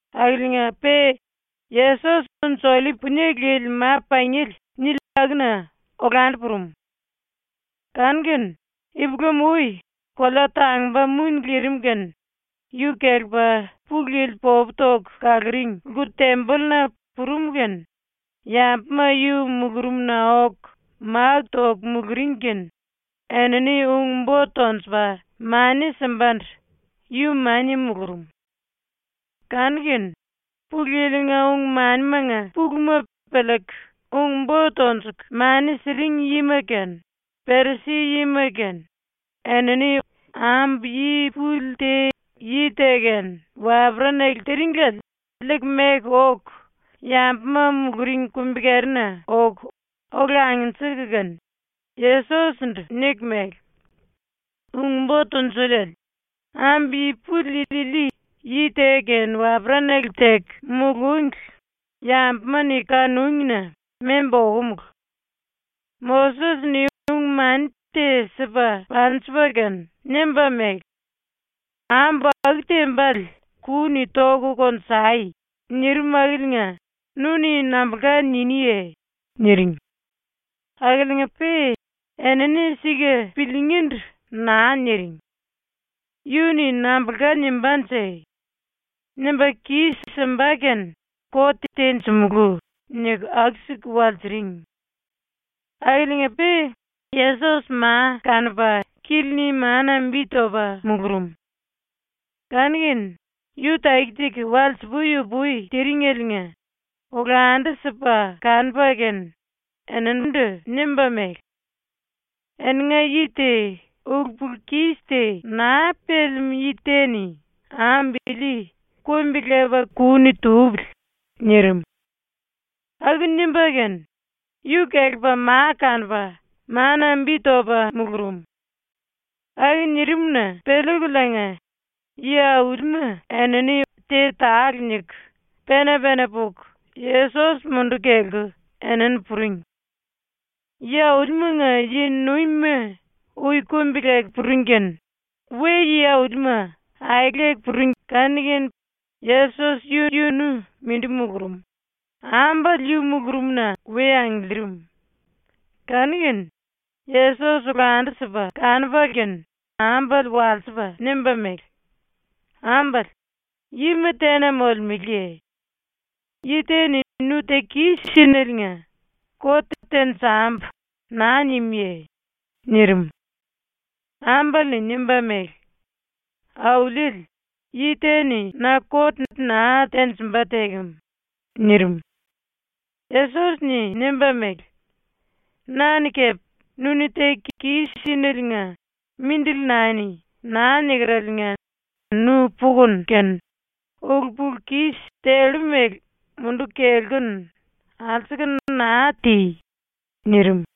akiliinga-pe Yesos ‘Unji-Ollip Punie Lili Ma-Pangiele’ nili akuna olandu purum. Kanu-kene ipulam-ui, kolea tangumba muni lirim kene yu kelepa ⸤Pulu Yili popu toku kaluring⸥ lku-tembolluna purum kene yambuma yu mulurumna oku máku toku muluring kene enini ung-bo tonjupa mani simbandu yu mania mulurum. Kanu-kene Pulu Yili-nga ung-manimanga puluma piliiku ung-bo tonjuku mani siring yima kene Perisi-yima kene enini ambu yi puli te yi te kene waperanale tiringliele liiku meku oku yambuma muluring kumbi-kerina oku ola angnjiku kene, Yesos-ndu niku mele: “Ung-Bo Tunjuliele, ambu yi puli ili yi te kene waperanale teku mulúngli yambuma-ni kanúngi-na membu okomulu. Moses-ni ung-mani te sipa panjipa kene nimba mele: “Ambu aku tembale ku-ni toku konjai.” nirim akiliinga nu-ni nambulka niniye?” niring. Akiliinga-pe enini sika piliingíndu naa niring. ‘Yu-ni nambulka nimbánje? Nimba kis-simba kene kot tenjimulú.’ niku aku-siku walsiring. Akiliinga-pe Yesos ma kanupa kili-ni mana bi topa mulurum. Kanu-kene yu taki-taki walsi-pui-upui tiringeliinga olandu-sipa kanupa kene eninindu nimba mele: “Eninga yi te ulu-pulu-kis te naa pelemú yi te-ni ambu ili kumbi-lepa ku-ni tupili.” nirim. Aku nimba kene yu kelepa ma kanupa mana bi topa mulurum. Aku nirim-na piliikuliinga yi-aulima enini te tale niku pena-pena puku Yesos munduku kelku enini puring. Yi-aulimanga yi-nuimima ui kumbi-leku puring kanu-kene we yi-aulima aeleku puring kene Yesos yu-yunu mindi mulurum, ambale yu mulurumna we angiliirim. Kanu-kene Yesos olandu-sipa kanupa kene ambale walsipa nimba mele: “Ambale, yima tena molemeleye? Yi te-ni nu ‘Teku kis-sínaliinga kot tenjambu.’ naa nimuye?” nirim. Ambale-ni nimba mele: “Auliele, yi te-ni na kot naa tenjimba tekem.” nirim. Yesos-ni nimba mele: “Na-ni kepe ‘Nu-ni teku kis-sínaliinga mindili nani.’ naa nikeraliinga nu pukunu kene ulu-pulu-kis tellu mele munduku kelkunu, alsuku naa ti!” nirim.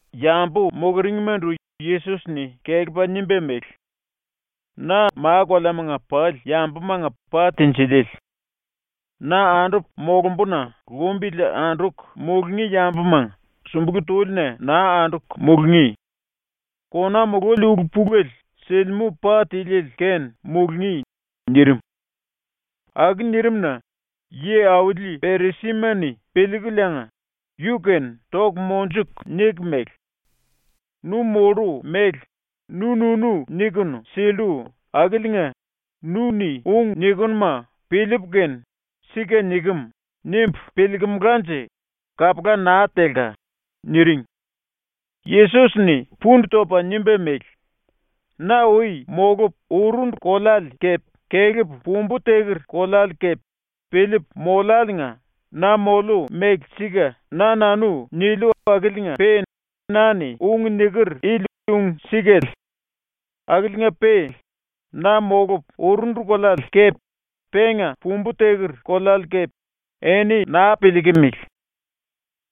Yambu muluringmandu Yesos-ni kelepa nimba mele: “Na ma-koleamanga pali yambumanga pa tinjiliele. Na andupu molumbuna lumbili anduku mulungí yambuma sumbulú túlina naa anduku mulungí. Kona mululi ulu-pulele silimú pa tiliele kene mulungí.” nirim. Aku nirim-na yi-auli Perisima-ni piliikuliinga yu-kene toku monjuku niku mele: “Nu mollu mele nu-nunu nikunu sillu akiliinga nu-ni ung nikinuma piliipu kene ‘Sika nikem.’ nimbu piliilkimilanje kapula naa telka.” niring. Yesos-ni pundu topa nimba mele: “Na ui molupu urundu koleale kepe kelepu pumbu teker koleale kepe piliipu moliáliinga na moliu mele sika na-nanu niliu akiliinga-pe na-ni ung niker ili ung-sikale. Akiliinga-pe na molupu urundu koleale kepe penga pumbu teker koleale kepe eni naa piliikimili.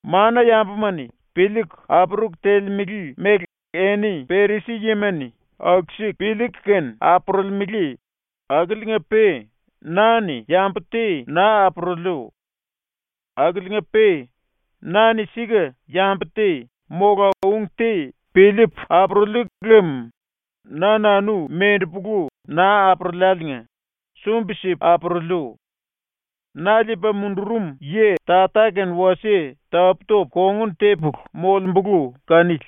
Mana-yambuma-ni piliiku apuruku telemele mele eni Perisi-yima-ni aku-siku piliiku kene apurulimele, akiliinga-pe na-ni yambu te naa apuruliu. Akiliinga-pe na-ni sika ⸤yambu te mola ung te piliipu apuruliu lem na-nanu mendepulu naa apuruliáliinga sumbi-sipu apuruliu. Na liipa mundurum yi Tata-kene wasie tapú-topu ⸤kongun tepulu⸥ molembulu kanili.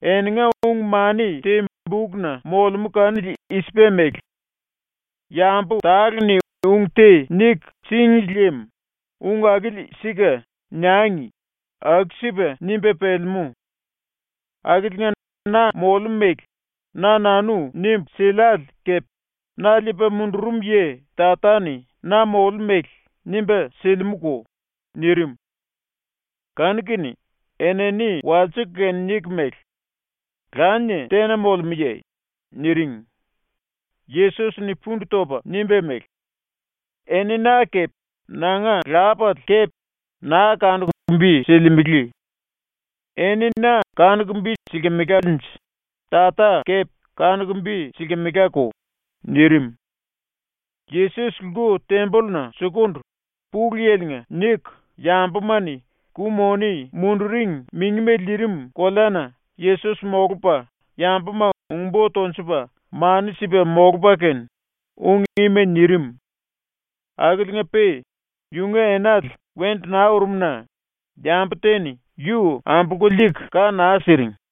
Eninga ung-mani te bukna molemú kanili i-sipa mele: ‘Yambu tale-ni ung te niku síngli lem ‘Ung akili sika.’ niangi.’ aku-sipa nimba pelemú. Akiliinga na moliu mele na-nanu nimbu siliále kepe; na liipa mundurum yi Tata-ni na moliu mele nimba silimúko.” nirim. Kanu-kene enini walsiku kene niku mele: “Lanie tena molemúye?” niring. Yesos-ni pundu topa nimba mele: “Eni na kepe nanga Lapale kepe naa kanuku bi silimele. Eni na kanuku bi silkimelanje Tata kepe kanuku bi silkimelako.” nirim. Yesos lku-tembolluna sukundu, Pulu Yili-nga niku yambuma-ni ku-moni munduring mingima lirim koleana Yesos molupa yambuma ung-bo tonjupa mani sipa molupa kene ung ima nirim. Akiliinga-pe yunga enale wendu naa urum-na yambu te-ni yu ambolku liiku ka naa siring.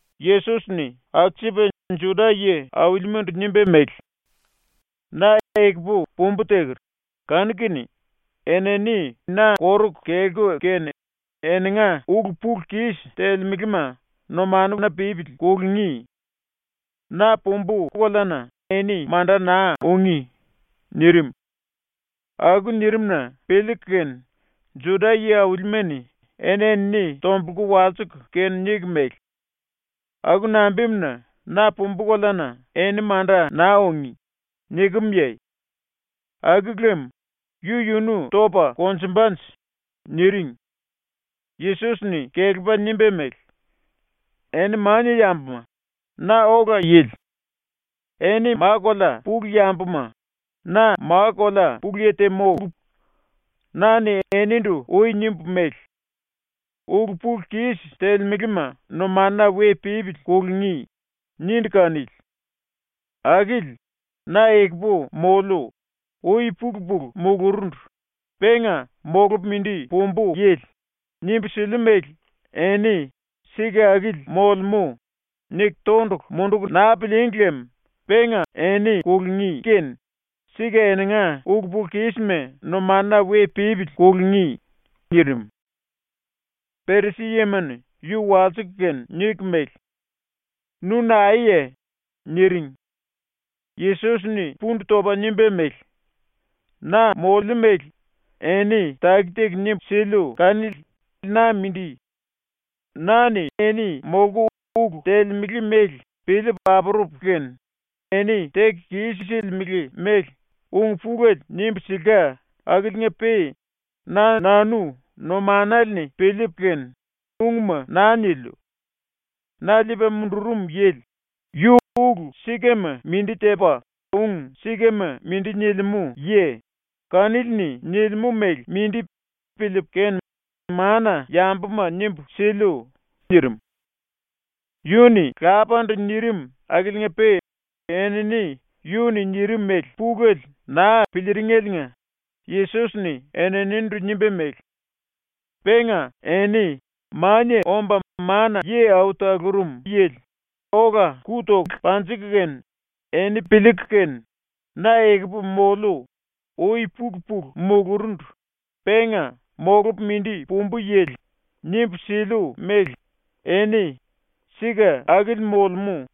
Yesos-ni alsupa Juda yi-aulimandu nimba mele: “Na ekupu pumbu teker, kanu-kene enini na koruku kelku kene eninga ulu-pulu-kis ⸤telemele⸥ma numanuna pípili kulungí. Na pumbu koleana eni manda naa ungí.” nirim. Aku nirim-na piliiku kene Juda yi-aulima-ni eni-enini tombulku walsiku kene niku mele: “Aku nambimuna ‘Na pumbu koleana eni manda naa ungí.’ nikemye? Aku lem yu-yunu topa konjumbanje?” niring. Yesos-ni kelepa nimba mele: “Eni mania yambuma, na ola yili. Eni ma-kolea pulu yambuma, na ma-kolea pulu yi te mólu. Na-ni enindu ui nimbu mele: “Ulu-pulu-kis ⸤telemele⸥ma numanuna we pípili kulungí.” nindu kanili. Akili “Na ekupu moliu, ui-pulu-pulu mulurundu, penga molupu mindi pumbu yili.” nimbu siliu mele eni ‘Sika akili molemú.’ niku tondulu munduku naa pilííngi lem penga eni kulungí kene sika eninga ulu-pulu-kísima numanuna we pípili kulungí.” nirim. Perisi-yima-ni yu walsiku kene niku mele: “Nu naeye?” niring. Yesos-ni pundu topa nimba mele: “Na moliu mele eni taki-taki nimbu siliu kanili na mindi. Na-ni eni molku ulu telemele mele piliipu apurupu kene eni teku kis-silimele mele ung pulele nimbu silka akiliinga-pe na-nanu numanale-ni piliipu kene ungma naa niliu. Na liipa mundurum yili, yu ulu sikama mindi tepa ung sikama mindi nilimú yi, kanili-ni nilimú mele mindi piliipu kene mana-yambuma nimbu siliu.” nirim. Yu-ni Lapandu nirim akiliinga-pe enini yu-ni nirim mele pulele naa piliiringeliinga Yesos-ni eninindu nimba mele: “Penga eni Mania Omba Mana-Yi Au Talurum Yili ola ku toku panjiku kene eni piliiku kene “Na ekupu moliu, ui-pulu-pulu mulurundu, penga molupu mindi pumbu yili.” nimbu siliu mele eni ‘Sika akili molemú.’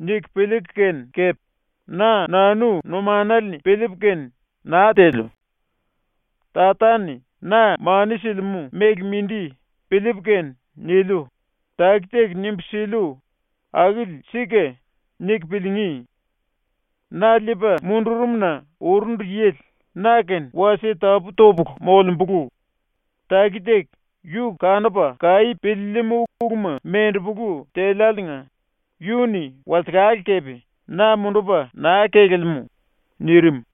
niku piliiku kene kepe, “Na-nanu numanale-ni piliipu kene naa teliu. Tata-ni na mani silimú mele mindi piliipu kene niliu.” taki-taki nimbu siliu ‘Akili sika.’ niku piliingí. Na liipa mundurum-na urundu yili na-kene wasie tapú-topulu molembulu; taki-taki yu kanupa kaí piliilimú uluma mendepolu teliáliinga yu-ni walsekale kepe na mundupa naa kelelemú.” nirim.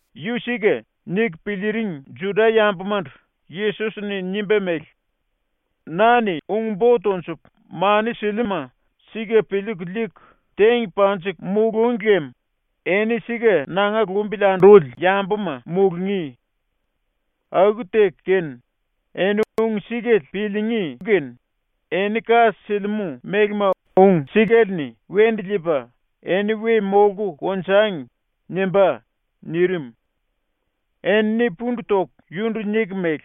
‘Yu sika.’ niku piliiring Juda-yambumandu Yesos-ni nimba mele: “Na-ni ung-bo tonjupu mani siliuma sika piliiku liiku teng panjiku mulúngi lem eni sika nanga lumbili anduli yambuma mulungí. Aku teku kene, eni ung-sikale piliingí kanu-kene eni ka silimú mélema ung-sikale-ni wendu liipa ‘eni we molku konjangi.’ nimbá.” nirim. Enini pundu toku yundu niku mele: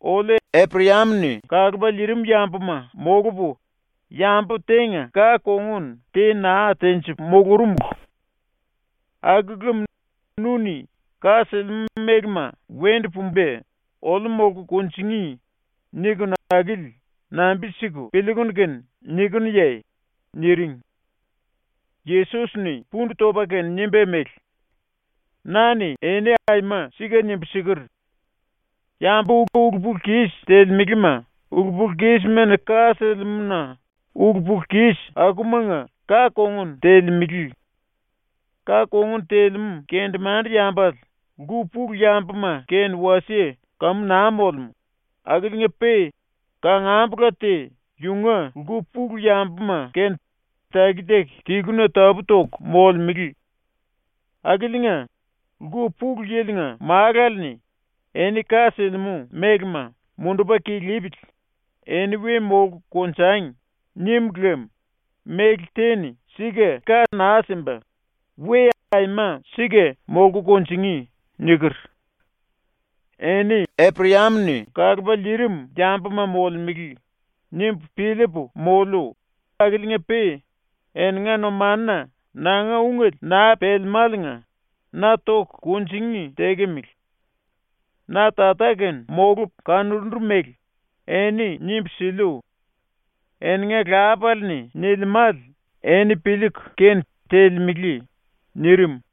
“Oliu Eprayam-ni kalupa liirim yambuma molupu, yambu tenga ka-kongun te naa tenjipu mulurumulu. Aku lem nu-ni ‘Ka silimú mélema wendu pumba oliu molku kunjingí.’ nikinu akili nambi-siku piliikunu kene nikinuye?” niring. Yesos-ni pundu topa kene nimba mele: “Na-ni eni aima sika nimbu siker: “Yambu ulu-pulu-kis telemelema ulu-pulu-kismani ka silimú-na ulu-pulu-kis akumanga ka-kongun telemele. Ka-kongun telemú kendemande-yambale lku pulu yambuma kene wasie kamu naa molemú, akiliinga-pe kangambula te yunga lku pulu yambuma kene taki-taki tiluna tapú-toku molemele. Akiliinga, ⸤Lku Pulu Yili-nga⸥ Málale-ni ‘Eni ka silimú mélema mundupa kilipili, eni we molku konjangi.’ nim lem méle te-ni sika ka naa simba, we aima sika molku kunjingí.” niker. “‘Eni Eprayam-ni kalupa liirim yambuma molemele.’ nimbu piliipu moliu akiliinga-pe eninga numanuna nanga ungele naa pelemáliinga na toku kunjingí tekemele. Na Tata-kene molupu kanurundu mele eni nimbu siliu. Eninga lapale-ni nilimále eni piliiku kene telemele.” nirim.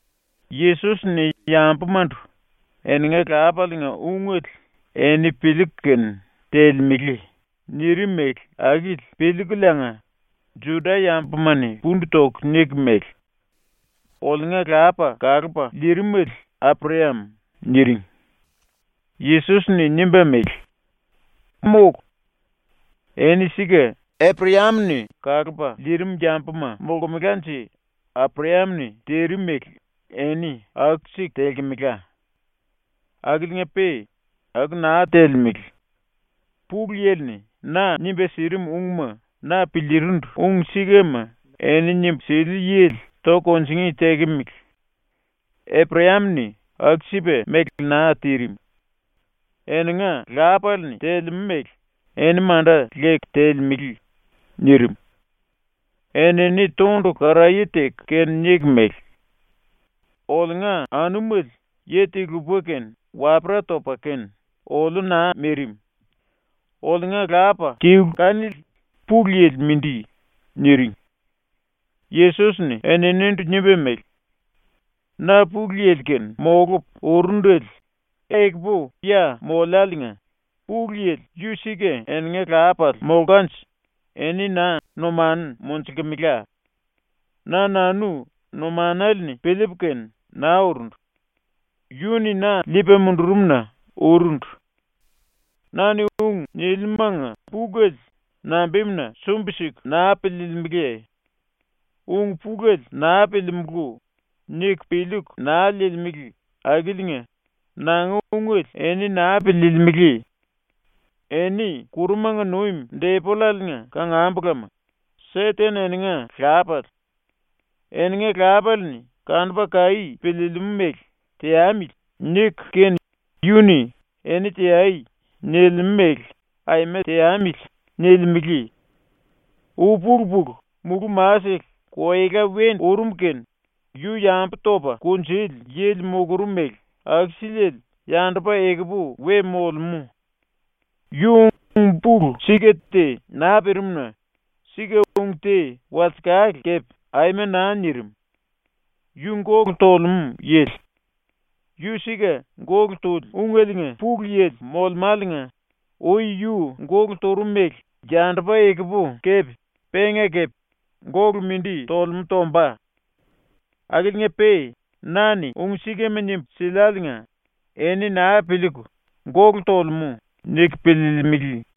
⸤Yesos-ni yambumandu “Eninga lapalenga ungele eni piliiku kene telemele.” nirim mele akili piliikuliinga⸥ Juda-yambuma-ni pundu toku niku mele: “Oliunga lapa kalupa liirimele Eprayam.” niring. Yesos-ni nimba mele: “Mólu. Eni sika Eprayam-ni kalupa liirim yambuma molkemelanje Eprayam-ni tirim mele eni aku-siku telkemela. Akiliinga-pe aku naa telemele. Pulu Yili-ni na nimba sirim ungma na piliirindu ung-sikama eni nimbu siliu yili toku kunjingí tekemele. Eprayam-ni aku-sipa mele naa tirim. Eninga lapale-ni telemú mele eni manda leku telemele.” nirim. Enini tondulu karaye teku kene niku mele: “Oliunga anumele yi-te-lupa kene wapera topa kene oliu naa mirim. Oliunga lapa tilu kanili Pulu Yili mindi.” niring. Yesos-ni eninindu nimba mele: “Na Pulu Yili-kene molupu urundele ekupu ya moliáliinga, Pulu Yili yu sika eninga Lapale molkanje eni na numanu monjulkemela. Na-nanu numanale-ni piliipu kene naa urundu. Yu-ni na liipa mundurum-na urundu. Na-ni ung niliumanga pulele nambimuna sumbi-siku naa piliilimiliye? ‘Ung-pulele naa piliimulú.’ niku piliiku naa liilimele akiliinga nanga ungele eni naa piliilimili. Eni ⸤kurumanga nuim⸥ Depollale-nga kangambulama, Seten eninga lapale. Eninga lapale-ni kanupa kaí piliilimú mele ‘teamili.’ niku kene yu-ni “Eni teai.” nilimú mele ‘Aima teamili.’ nilimele. Ui-pulu-pulu mulú-masele koela wendu urum kene yu yambu topa kunjuli yili mulurum mele aku-siliele yandupa ekupu we molemú. Yu ung-pulu sika te naa pirim-na sika-ung te walsekale kepe aima naa nirim. Yu gólu tolemú yili; yu sika gólu tuli ungeliinga pulu-yili molemáliinga ui yu gólu turum mele yandupa ekupu kepe penga kepe gólu mindi tolemú tomba. Akiliinga-pe na-ni ung-sikama nimbu siliáliinga eni naa piliiku ‘Gólu tolemú.’ niku piliilimili.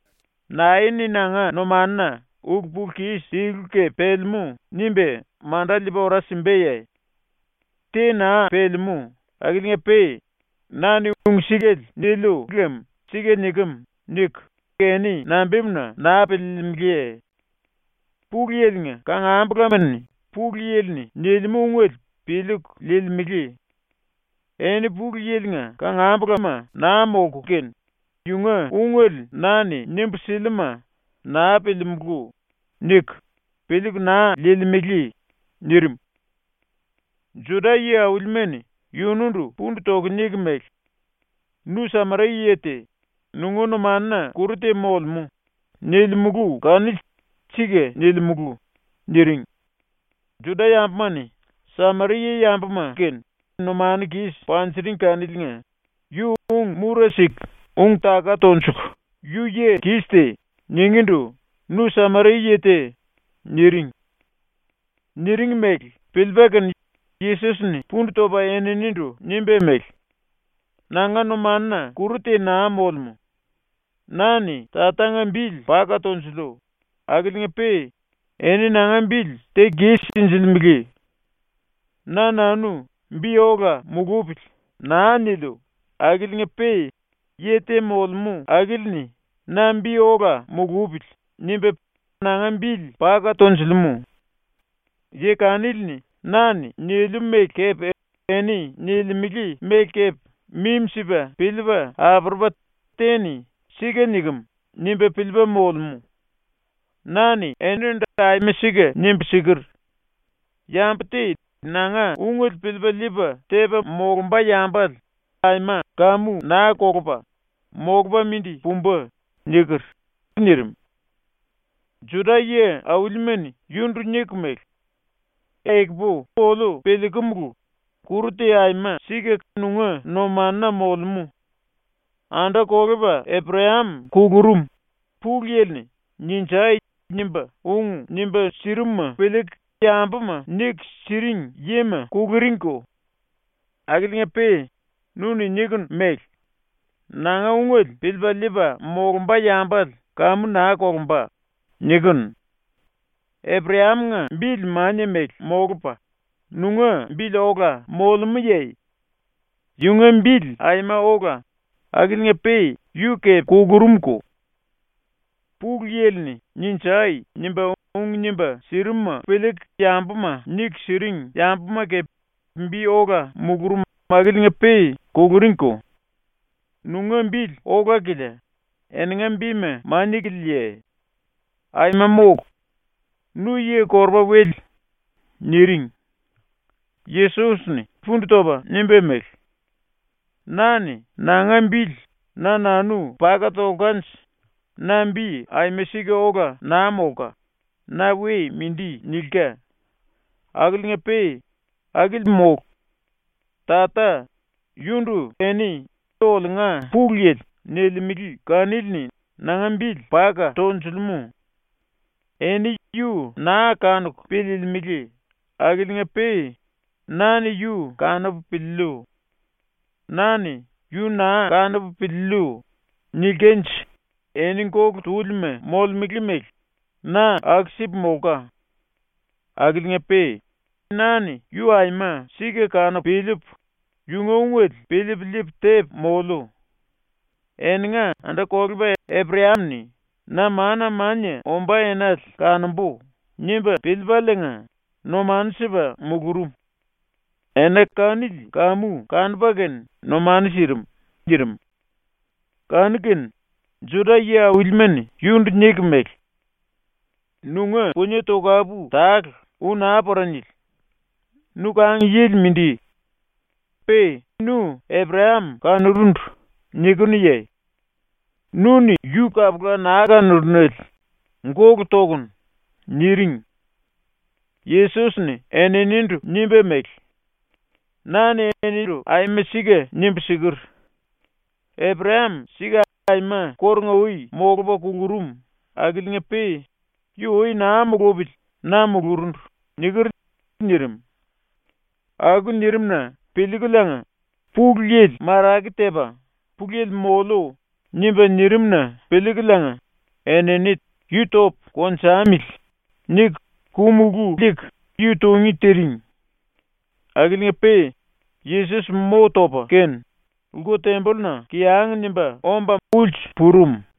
“Nae-ni nanga numanuna ulu-pulu-kis tilu kepe pelemú nimba manda liipa ora simbaye? ⸤Te naa pelemú akiliinga-pe⸥ na-ni ung-sikale niliu lem ‘Sika nikem.’ niku eni nambimuna naa piliilimiliye? Pulu Yili-nga kangambulama-ni Pulu Yili-ni nilimú ungele piliiku liilimele. Eni Pulu Yili-nga kangambulama naa molku kene yunga ungele na-ni nimbu siliuma “Naa piliimulú.” niku, piliiku naa liilimele.” nirim. Juda yi-aulima-ni yundu pundu toku niku mele: “ “Nu Sameria-yi te, nunga numanuna kuru te molemú.” nilimulu kanili sika nilimulu.” niring. ⸤Juda-yambuma-ni Sameria-yambuma kene numanu kis panjiring kaniliinga yu ung-mura siku ung-taka tonjuku “Yu yi kis te.” ningíndu “Nu Sameria-yi te.” niring.⸥ Niring mele piliipa kene Yesos-ni pundu topa eninindu nimba mele: “Nanga numanuna kuru te naa molemú. Na-ni Tatanga bili paka tonjuliu, akiliinga-pe eni nanga bili teku kis-sinjilimele. Na-nanu ‘Bi ola mulupili.’ naa niliu, akiliinga-pe yi te molemú akili-ni ‘Na bi ola mulupili.’ nimba nanga bili paka tonjulemú. Yi kanili-ni na-ni niliu mele kepe eni nilimele mele kepe mimi-sipa piliipa apurupa te-ni ‘Sika nikem.’ nimba piliipa molemú. Na-ni enindu aima sika nimbu siker: “Yambu te nanga ungele piliipa liipa tepa molumba yambale aima kamu naa kolupa, molupa mindi pumba.” niker.” nirim. Juda yi-aulima-ni yundu niku mele: “Ekupu oliu piliikumulu, kuru te aima sika nunga numanuna molemú. Anda-kolepa Eprayam kulurum; Pulu Yili-ni “Ninjai!” nimba ung nimba sirimuma piliiku yambuma niku siring yima kuluringko. Akiliinga-pe nu-ni nikunu mele: “Nanga ungele piliipa liipa molumba yambale kamu naa kolumba.” nikinu. Eprayam-nga bili mania mele molupa nunga bili ola molemúye? Yunga bili aima ola, akiliinga-pe yu kepe kulurumko. Pulu Yili-ni “Ninjai!” nimba ung nimba sirimuma piliiku yambuma niku siring yambuma kepe bi ola mulurum akiliinga-pe kuluringko. Nunga bili ola-kilia, eninga bima mania-kiliaye? Aima mólu! Nu yi-korupa-wele.” niring. Yesos-ni pundu topa nimba mele: “Na-ni nanga bili na-nanu paka tolkanje na bi aima sika ola naa molka, na we mindi nilka. Akiliinga-pe akili mólu. Tata, yundu eni “Oliunga Pulu Yili.” nilimele kanili-ni nanga bili paka tonjulemú. Eni yu naa kanuku piliilimili akiliinga-pe na-ni yu kanupu piliiliu. Na-ni “Yu naa kanupu piliiliu.” nilkanje eni gólu túlima molemele mele na aku-sipu molka. Akiliinga-pe na-ni yu aima sika kanupu piliipu, yunga ungele piliipu liipu tepu moliu. Eninga anda-kolepa Eprayam-ni ‘Na mana-mania ombá enale kanombu.’ nimba piliipaliinga numanu sipa mulurum. Ena kanili kamu kanupa kene numanu sirim.” nirim. Kanu-kene Juda yi-aulima-ni yundu niku mele: “Nunga punie tokapu tale ui naa pora nili. Nu kang-yili mindi. Pe nu “Eprayam kanurundu.” nikinuye? Nu-ni yu kapula naa kanurunele. Gólu tokunu.” niring. Yesos-ni eninindu nimba mele: “Na-ni enindu aima sika nimbu siker: “Eprayam sika aima kórunga-ui molupa kulurum akiliinga-pe yu ui naa mulupili na mulurundu.” niker.” nirim. Aku nirim-na piliikuliinga ⸤Pulu Yili marake tepa ‘Pulu Yili moliu.’ nimba nirim-na piliikuliinga⸥ enini “Yu topu konjamili.” niku ku-mulú liiku yu tungí tiring. Akiliinga-pe Yesos mo topa kene, lku-tembolluna kiyang nimba omba ulsu purum.